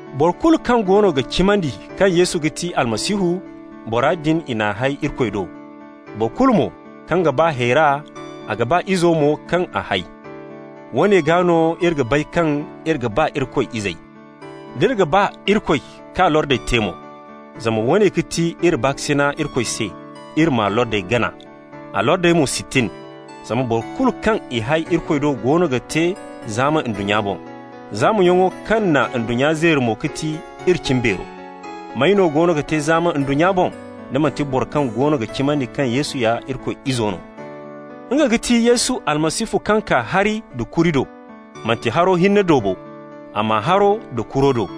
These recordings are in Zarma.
Boro kulu kaŋ goono ga cimandi kaŋ Yesu ga ti Almasihu, bora din, i n'a hay Irikoy do. Boro kulu mo kaŋ ga ba hayra, a ga ba izo mo kaŋ a hay. Woone gaa no iri ga bay kaŋ iri ga ba Irikoy izey: d'iri ga ba Irikoy k'a lordey te mo. Zama woone ga ti iri baakasina Irikoy se: iri m'a lordey gana. A lordey mo si tin. Zama boro kulu kaŋ i hay Irikoy do goono ga te zaama ndunnya boŋ. Zaamayaŋo kaŋ na ndunnya zeeri mo ga ti iri cimbeero. May no goono ga te zaama ndunnya boŋ, da manti boro kaŋ goono ga cimandi kaŋ Yesu ya Irikoy Izo no? Nga ga ti Yesu Almasihu kaŋ kaa hari da kuri do. Manti haro hinne do bo, amma haro da kuro do.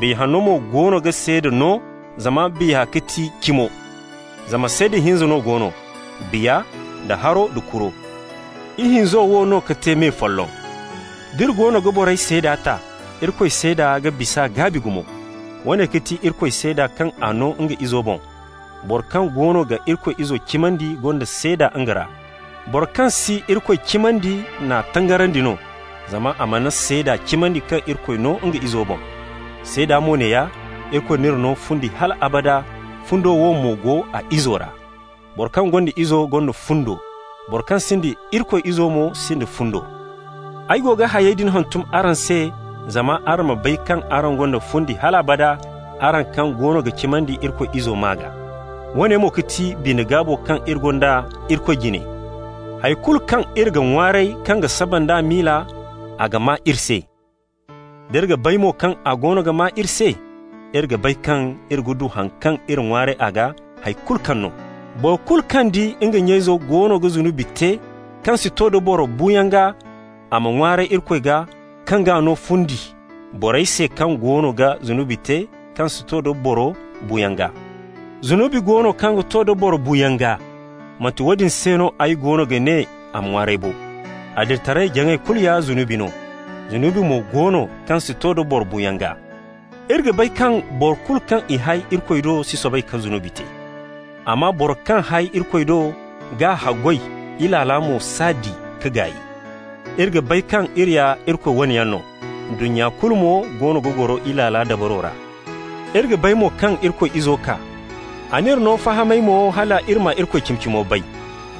Biya Hanno mo goono ga seeda no zama Biya ga ti cimo. Zama seeda hinza no go no: Biya da haro da kuro, ihinzo wo no ka te me folloŋ. D'iri goono ga borey seeda ta, Irikoy seeda ga bis'a gaabi gumo. Woone ga ti Irikoy seeda kaŋ a no nga Izo boŋ. Boro kaŋ goono ga Irikoy Izo cimandi gonda seeda nga ra. Boro kaŋ si Irikoy cimandi n'a tangarandi no, zama a mana seeda cimandi kaŋ Irikoy no nga Izo boŋ. Seeda mo neeya: Irikoy n'iri no fundi hal abada, fundo wo mo go a Izo ra. Boro kaŋ gonda Izo gonda fundo. Boro kaŋ sinda Irikoy Izo mo sinda fundo. Ay go ga hayey din hantum araŋ se zama araŋ ma bay kaŋ araŋ gonda fundi hal abada, araŋ kaŋ goono ga cimandi Irikoy Izo maa gaa. Woone mo ga ti bine-gaabo kaŋ iri gonda Irikoy jine: hay kulu kaŋ iri ga ŋwaaray kaŋ ga saba nd'a miila, a ga maa iri se. D'iri ga bay mo kaŋ a goono ga maa iri se, iri ga bay kaŋ iri ga du haŋ kaŋ iri ŋwaaray a gaa, hay kulu kaŋ no. Boro kulu kaŋ di nga nya-izo goono ga zunubi te kaŋ si to da boro buuyaŋ gaa, a ma ŋwaaray Irikoy gaa, kaŋ g'a no fundi, borey se kaŋ goono ga zunubi te kaŋ si to da boro buuyaŋ gaa. Zunubi go no kaŋ ga to da boro buuyaŋ gaa. Manti woodin se no ay goono ga ne a ma ŋwaaray bo. Adilitaray-jaŋay kulu ya zunubi no. Zunubi mo go no kaŋ si to da boro buuyaŋ gaa. Iri ga bay kaŋ boro kulu kaŋ i hay Irikoy do si soobay ka zunubi te, amma Bora kaŋ hay Irikoy do g'a haggoy. Ilaala mo s'a di ka gaay. Iri ga bay kaŋ iri ya Irikoy wane yaŋ no, ndunnya kulu mo goono ga goro Ilaala dabaro ra. Iri ga bay mo kaŋ Irikoy Izo kaa, a n'iri no fahamay mo, hal iri ma Irikoy cimi-cimo bay.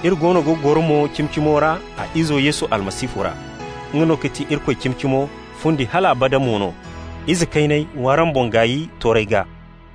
Iri goono ga goro mo Cimi-Cimo ra a Izo Yesu Almasihu ra. Nga no ga ti Irikoy cimi-cimo, fundi hal abada mo no. Ize kayney, w'araŋ boŋ gaay toorey gaa.